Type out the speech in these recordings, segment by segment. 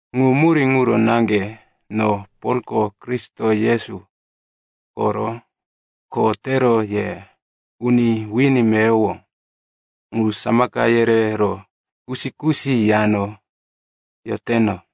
Ŋu murí ŋuro naŋge no Polko Kristo Yesu koro kho tero ye uni wini meyowo ŋu samaka yerero kusi-kusi yano yoteno.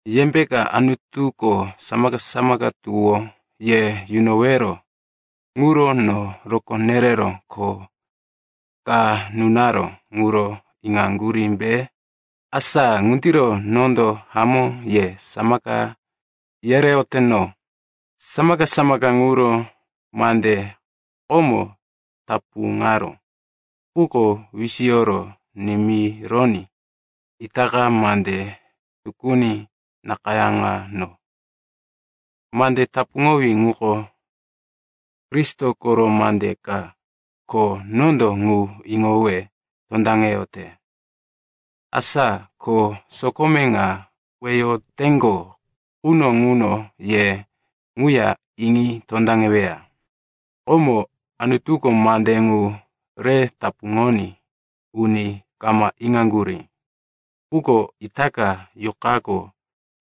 Yembeka Anutuko samaka-samaka tuwó ye yunowero ŋuro no rokó nerero kho ka nunaró ŋuro iŋaŋgurímbe? Asa ŋundiro nondo hamó ye samaka yereyoteno. Samaka-samaka ŋuro mande komo tapuŋaró, quko wisiyoro nimironí itaka mande tukuni nakayáŋano. Mande tapuŋowí ŋuko Kristo koro mande ka, ko nondo ŋu iŋowe tondaŋeyote. Asa ko sokome ŋa weyoteŋgo quno ŋuno ye ŋuya iŋi tondaŋeweya. Komoko Anutuko mande ŋu re tapuŋoní uni kama iŋaŋgurí. Quko itaka Yuqako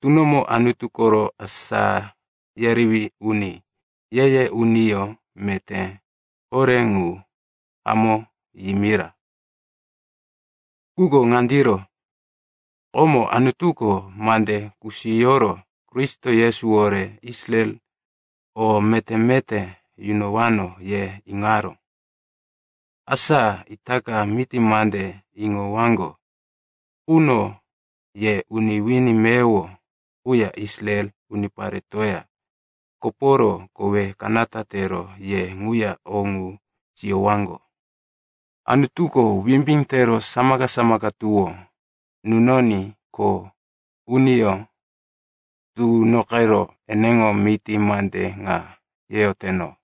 tunomo Anutu koro asá yerewí uni, ye-ye uniyó meté horé ŋu hamó yimira. Ŋuko ŋandiro: komo Anutuko mande kusiyoro, Kristo Yesuwore Israel o meté-meté yunowano, ye iŋaró. Asa itaka miti mande iŋowaŋgo quno ye uni wini meyowo quya Israel uniparetoya koporo kowe kanata tero ye ŋuya o ŋu siyowaŋgo. Anutuko wimbí tero samaka-samaka tuwó nunoní kho uniyó tunoqero eneŋo miti mande ŋa yeyoteno.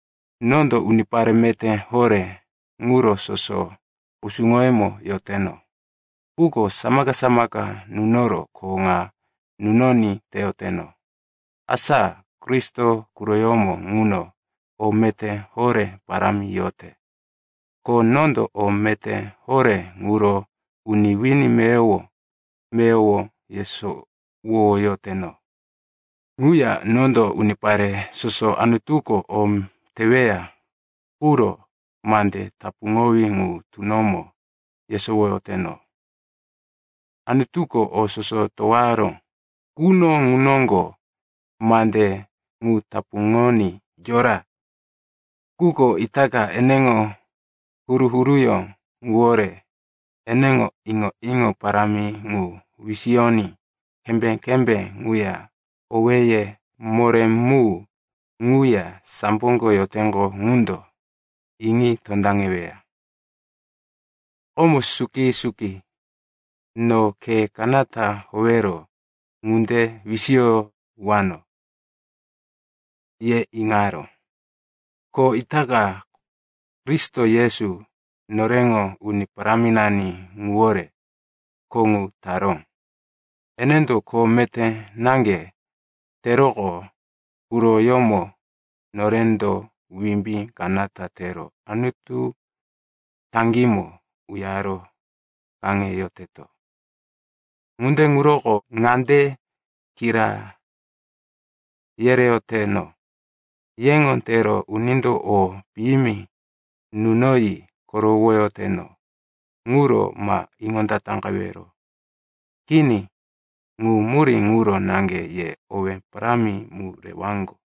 Nondo unipare meté horé ŋuro soso kusuŋoyemo yoteno. Quko samaka-samaka nunoro kho ŋa nunoní teyoteno. Asa Kristo quroyómo ŋuno o meté horé parámi yote, ko nondo o meté horé ŋuro uni wini meyowo-meyowo yesowoyoteno. Ŋuya nondo unipare soso Anutuko o teweya quro mande tapuŋowí ŋu tunomo yesowoyoteno. Anutuko o soso towaró quno ŋu noŋgo mande ŋu tapuŋoní yora. Quko itaka eneŋo huru-huruyó ŋuwore eneŋo iŋo-iŋo parámi ŋu wisiyoní kembé-kembé ŋuya owéye moré mu ŋuya samboko yoteŋgo ŋundo iŋi tondaŋeweya. Komo suki-suki, no khe kanata howero ŋunde wisiyowano, ye iŋaró. Ko itaka Kristo Yesu, noreŋo Uni Paráminani ŋuwore kho ŋu taró. Enendo kho meté naŋge teroqo, quroyómo norendo wimbí kanata tero Anutu taŋgímo uyaro kaŋeyoteto. Ŋunde ŋuroko ŋande kira yereyoteno, yeŋo tero unindo o piyimi nunoyi korowoyoteno ŋuro ma iŋondataqewero. Kini, ŋu murí ŋuro naŋge ye owé parámi mu rewaŋgo.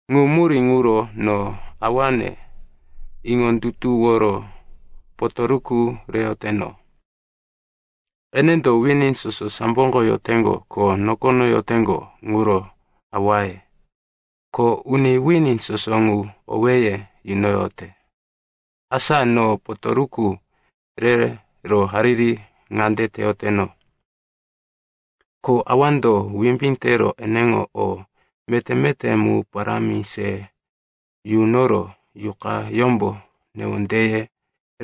Ŋu murí ŋuro no Awane iŋondutuworo potoruku reyoteno. Enendo wini soso samboko yoteŋgo ko nokono yoteŋgo ŋuro awaye, ko uni wini soso ŋu owéye yunoyote. Asa no potoruku rero hariri ŋande teyoteno, ko Awando wimbí tero eneŋo o meté-meté mu parámi se yunoro Yuqayómbo newondeye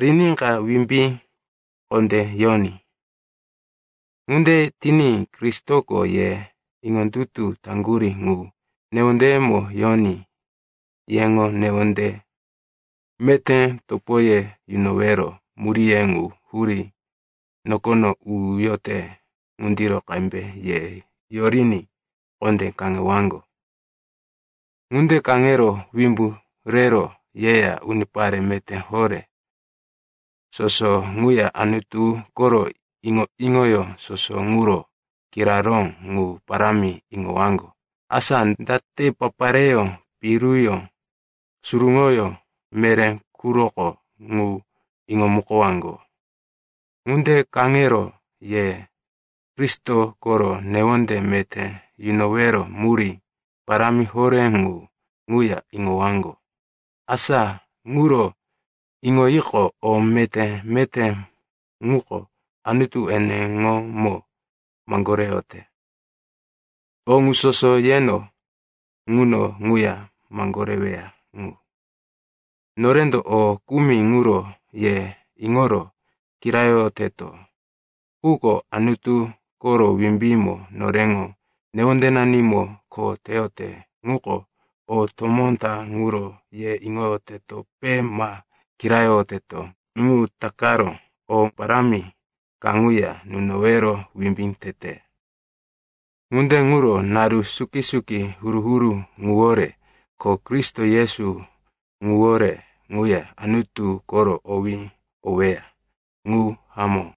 riníka wimbí kondé yoní. Ŋunde tiní Kristoko ye iŋondutu taŋgurí ŋu newondeyemo yoní yeŋo newonde meté topoye yunowero muríye ŋu hurí nokono uyote ŋundiro qembe ye yoriní kondé kaŋewaŋgo. Ŋunde kaŋero wimbu rero yeya unipare meté horé soso ŋuya Anutu koro iŋo-iŋoyó soso ŋuro kiraró ŋu parámi iŋowaŋgo, asa date papareyó, piruyó, suruŋoyó, meré quroko ŋu iŋomukowaŋgo. Ŋunde kaŋero ye Kristo koro newonde meté yunowero murí parámi horé ŋu ŋuya iŋowaŋgo. Asa ŋuro iŋoyiqo, o meté-meté ŋuko Anutu eneŋomo maŋgoreyote, o ŋu soso yeno ŋuno ŋuya maŋgoreweya ŋu. Norendo o kumi ŋuro ye iŋoro kirayoyoteto. Quko Anutu koro wimbímbo noreŋo newondenanimo kho teyote ŋuko o tomó ta ŋuro ye iŋoyotetope ma kirayoyoteto ŋu takaro o parámi kaŋuya nunowero wimbí tete. Ŋunde ŋuro naru suki-suki huru-huru ŋuwore ko Kristo Yesu ŋuwore ŋuya Anutu koro owí oweya. Ŋu hamó.